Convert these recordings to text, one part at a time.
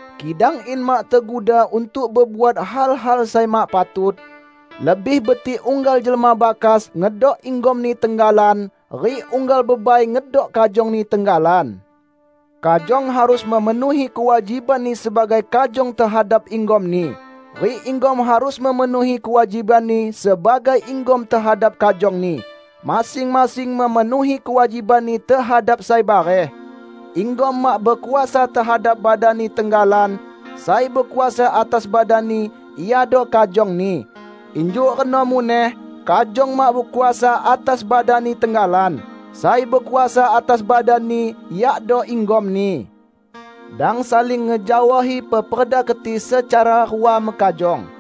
Kidang in mak teguda untuk bebuat hal-hal sai mak patut, lebih betik unggal jelma bakas ngedok inggomni tenggalan rik unggal bebai ngedok kajongni tenggalan. Kajong harus memenuhi kewajibanni sebagai kajong tehadap inggomni, rik inggom harus memenuhi kewajibanni sebagai inggom tehadap kajongni; masing-masing memenuhi kewajibanni tehadap sai bareh. Inggom mak bekuasa tehadap badanni tenggalan; sai bekuasa atas badanni iado kajongni. Injuk reno muneh kajong mak bekuasa atas badanni tenggalan; sai bekuasa atas badanni yakdo inggomni. Dang saling ngejaohi peperda keti secara rua mekajong.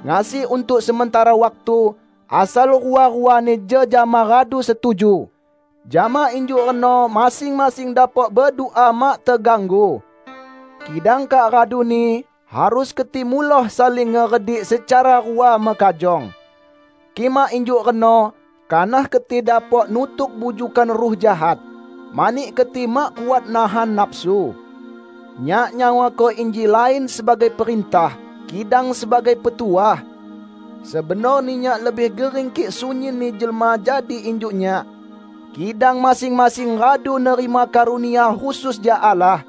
Ngasi untuk sementara waktu, asal rua-ruani jejama radu setuju. Jama injuk reno masing-masing dapok bedua mak teganggu. Kidang kak raduni, harus keti muloh saling ngeredik secara rua mekajong. Kik mak injuk reno, kanah keti dapok nutuk bujukkan ruh jahat, mani keti mak kuat nahan nafsu. Nyak nyawako inji lain sebagai perintah, kidang sebagai petuah. Sebenorni nyak lebih gering kik sunyinni jelma jadi injuk nyak. Kidang masing-masing radu nerima karunia khusus jak Allah.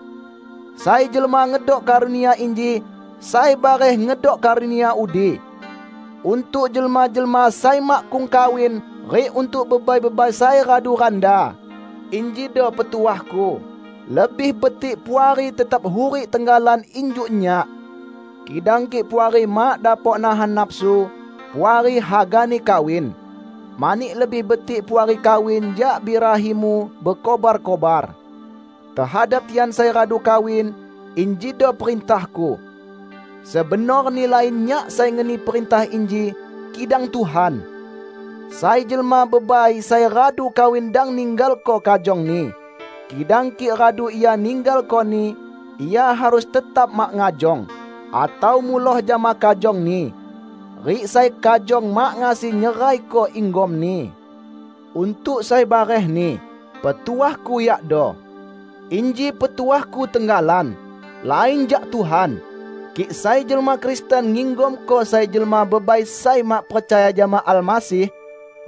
Sai jelma ngedok karunia inji, sai bareh ngedok karunia udi. Untuk jelma-jelma sai makkung kawin rik untuk bebai-bebai sai radu randa, injido petuahku: Lebih betik Puari tetap hurik tenggalan injuk nyak. Kidang kik Puari mak dapok nahan nafsu, Puari hagani kawin. Mani lebih betik Puari kawin jak birahimu bekobar-kobar. Tehadap tian sai radu kawin, injido perintahku: (Sebenorni lain nyak sai ngeni perintah inji, kidang Tuhan.) Sai jelma bebai sai radu kawin dang ninggalko kajongni. Kidang kik radu ia ninggalkoni, ia harus tetap mak ngajong, atau muloh jama kajongni. Rik sai kajong mak ngasi nyeraiko inggomni. Untuk sai barehni, petuahku yakdo: -- inji petuahku tenggalan, lain jak Tuhan -- kik sai jelma Kristen nginggomko sai jelma bebai sai mak percaya jama Almasih,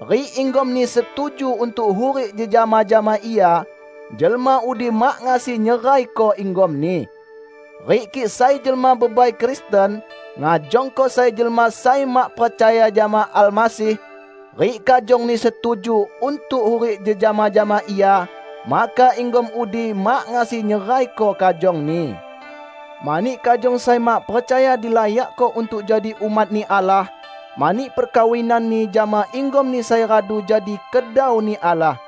rik inggomni setuju untuk hurik jejama jama ia, jelma udi mak ngasi nyeraiko inggomni. Rik kik sai jelma bebai Kristen ngajongko sai jelma sai mak percaya jama Almasih, rik kajongni setuju untuk hurik jejama jama ia, maka inggom udi mak ngasi nyeraiko kajongni. Mani kajong sai mak percaya dilayakko untuk jadi umat-Ni Allah mani perkawinanni jama inggomni sai radu jadi kedau-Ni Allah.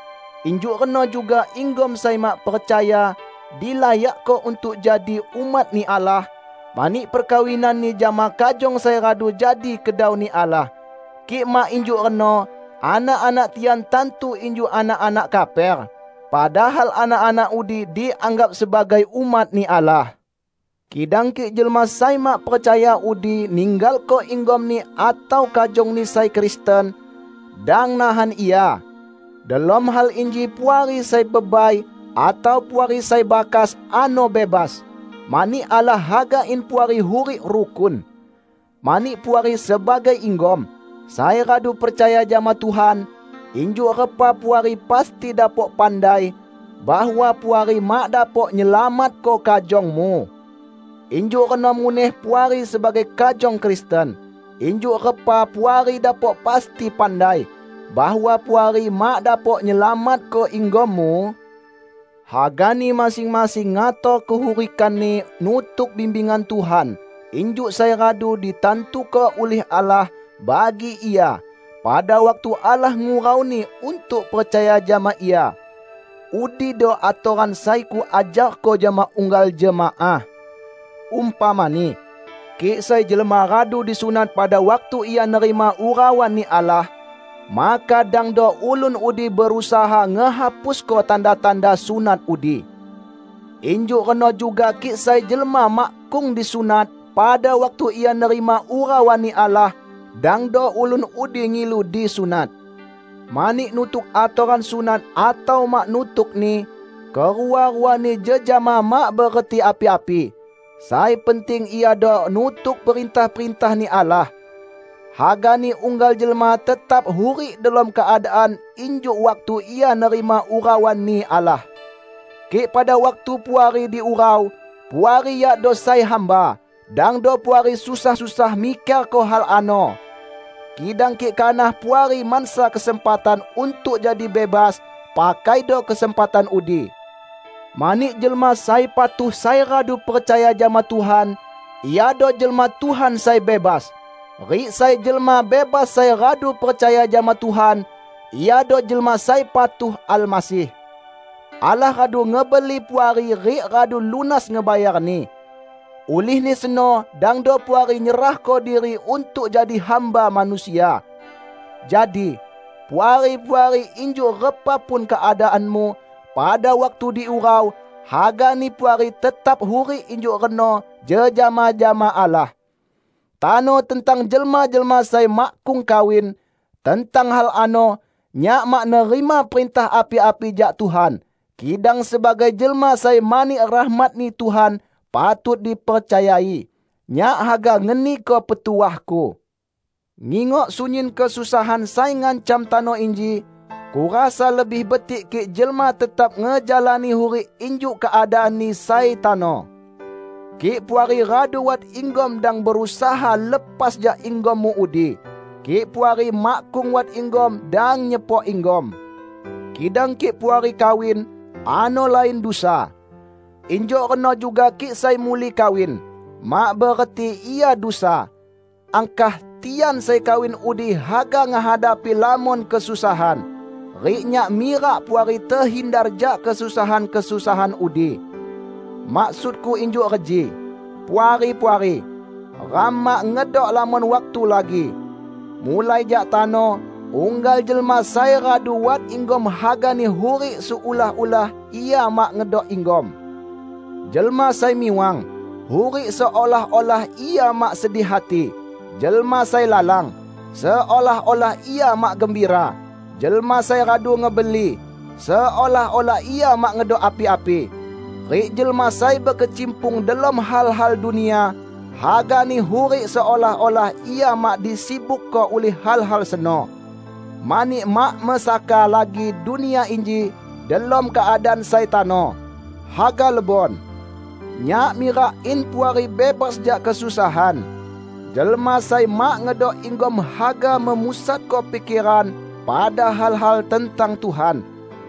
Injuk reno juga inggom sai mak percaya dilayakko untuk jadi umat-Ni Allah, mani perkawinanni jama kajong sai radu jadi kedau-Ni Allah. Kik mak injuk reno, anak-anak tian tantu injuk anak-anak kaper, padahal anak-anak udi dianggap sebagai umat-Ni Allah. Kidang kik jelma sai mak percaya udi ninggalko inggomni atau kajongni sai Kristen, dang nahan ia. Delom hal inji Puari sai bebai atau Puari sai bakas ano bebas, mani Allah haga in Puari hurik rukun. Mani Puari sebagai inggom -- sai radu percaya jama Tuhan -- injuk repa Puari pasti dapok pandai bahwa Puari mak dapok nyelamatko kajongmu? Injuk reno muneh Puari sebagai kajong Kristen, injuk repa Puari dapok pasti pandai bahwa Puari mak dapok nyelamatko inggommu? Hagani masing-masing ngator kehurikanni nutuk bimbingan Tuhan injuk sai radu ditantuko ulih Allah bagi ia pada waktu Allah ngurauni untuk percaya jama Ia. Udido atoran sai kuajarko jama unggal jemaah. Umpamani, kik sai jelma radu disunat pada waktu ia nerima urauan-Ni Allah, maka dangdo ulun udi berusaha ngehapusko tanda-tanda sunat udi. Injuk reno juga kik sai jelma makkung disunat pada waktu ia nerima urauan-Ni Allah, dangdo ulun udi ngilu disunat. Mani nutuk atoran sunat atau mak nutukni, kerua-ruani jejama mak bereti api-api. Sai penting iado nutuk perintah-perintah-Ni Allah. Hagani unggal jelma tetap hurik delom keadaan injuk waktu ia nerima urauan-Ni Allah. Kik pada waktu Puari diurau, Puari yakdo sai hamba, dangdo Puari susah-susah mikerko hal ano. Kidang kik kanah Puari mansa kesempatan untuk jadi bebas, pakaido kesempatan udi. Mani jelma sai patuh sai radu percaya jama Tuhan, iado jelma Tuhan sai bebas. Rik sai jelma bebas sai radu percaya jama Tuhan, iado jelma sai patuh Almasih. Allah radu ngebeli Puari rik radu lunas ngebayarni. Ulihni seno dangdo Puari nyerahko diri untuk jadi hamba manusia. Jadi, Puari-puari injuk repa pun keadaanmu pada waktu diurau, hagani Puari tetap hurik injuk reno jejama jama Allah. Tano tentang jelma-jelma sai makkung kawin. Tentang hal ano, nyak mak nerima perintah api-api jak Tuhan. Kidang sebagai jelma sai mani rahmat-Ni Tuhan patut dipercayai, nyak haga ngeniko petuahku. Ngingok sunyin kesusahan sai ngancam tano inji, kurasa lebih betik kik jelma tetap ngejalani hurik injuk keadaanni sai tano. Kik Puari radu wat inggom dang berusaha lepas jak inggommu udi. Kik Puari makkung wat inggom dang nyepok inggom. Kidang kik Puari kawin, ano lain dusa. Injuk reno juga kik sai muli kawin, mak bereti ia dusa. Angkah, tian sai kawin udi haga ngehadapi lamon kesusahan. Rik nyak mirak Puari tehindar jak kesusahan-kesusahan udi. Maksudku injuk reji, Puari-puari: Ram mak ngedok lamon waktu lagi. Mulai jak tano, unggal jelma sai radu wat inggom hagani hurik seolah-olah ia mak ngedok inggom; jelma sai miwang, hurik seolah-olah ia mak sedih hati; jelma sai lalang, seolah-olah ia mak gembira; jelma sai radu ngebeli, seolah-olah ia mak ngedok api-api; rik jelma sai bekecimpung delom hal-hal dunia, hagani hurik seolah-olah ia mak disibukko ulih hal-hal seno. Mani mak mesaka lagi dunia inji, delom keadaan sai tano, haga lebon! Nyak mirak in Puari bebas jak kesusahan. Jelma sai mak ngedok inggom haga memusatko pikeran pada hal-hal tentang Tuhan,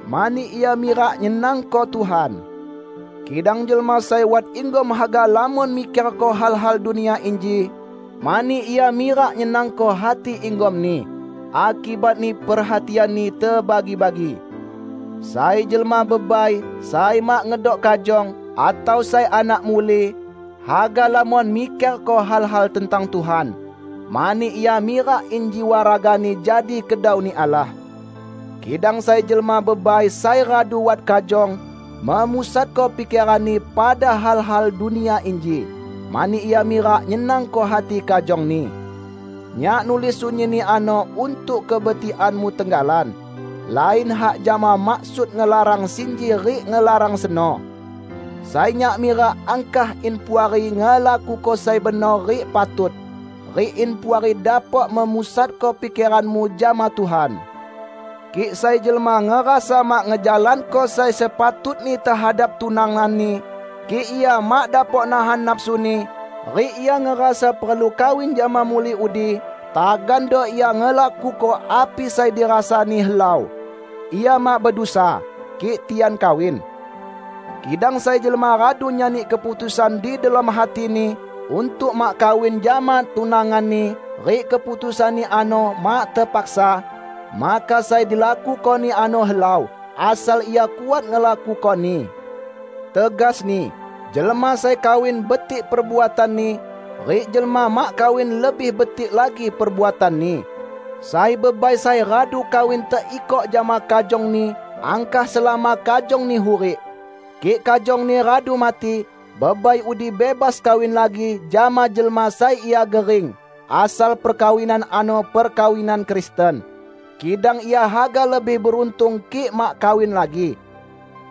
mani ia mirak nyenangko Tuhan. Kidang jelma sai wat inggom haga lamon mikerko hal-hal dunia inji, mani ia mirak nyenangko hati inggomni; akibatni perhatianni tebagi-bagi. Sai jelma bebai sai mak ngedok kajong, atau sai anak muli, haga lamon mikerko hal-hal tentang Tuhan, mani ia mirak in jiwa ragani jadi kedau-Ni Allah. Kidang sai jelma bebai sai radu wat kajong, memusatko pikeranni pada hal-hal dunia inji, mani ia mirak nyenangko hati kajongni. Nyak nulis sunyinni ano untuk kebetikanmu tenggalan, lain hak jama maksud ngelarang sinji rik ngelarang seno. Sai nyak mirak angkah in Puari ngelakuko sai benor rik patut, rik in Puari dapok memusatko pikeranmu jama Tuhan. Kik sai jelma ngerasa mak ngejalanko sai sepatutni tehadap tunanganni, kik ia mak dapok nahan nafsuni, rik ia ngerasa perlu kawin jama muli udi, tagando ia ngelakuko api sai dirasani helau. Ia mak bedusa, kik tian kawin. Kidang sai jelma radu nyani keputusan di delom hatini untuk mak kawin jama tunanganni rik keputusanni ano mak tepaksa, maka sai dilakukoni ano helau, asal ia kuat ngelakukoni. Tegasni, jelma sai kawin betik perbuatanni, rik jelma mak kawin lebih betik lagi perbuatanni. Sai bebai sai radu kawin teikok jama kajongni angkah selama kajongni hurik. Kik kajongni radu mati, bebai udi bebas kawin lagi jama jelma sai ia gering; asal perkawinan ano perkawinan Kristen. Kidang ia haga lebih beruntung kik mak kawin lagi.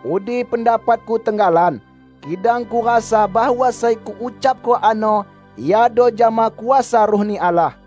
Udi pendapatku tenggalan, kidang kurasa bahwa sai kuucapko ano iado jama kuasa Ruh-Ni Allah.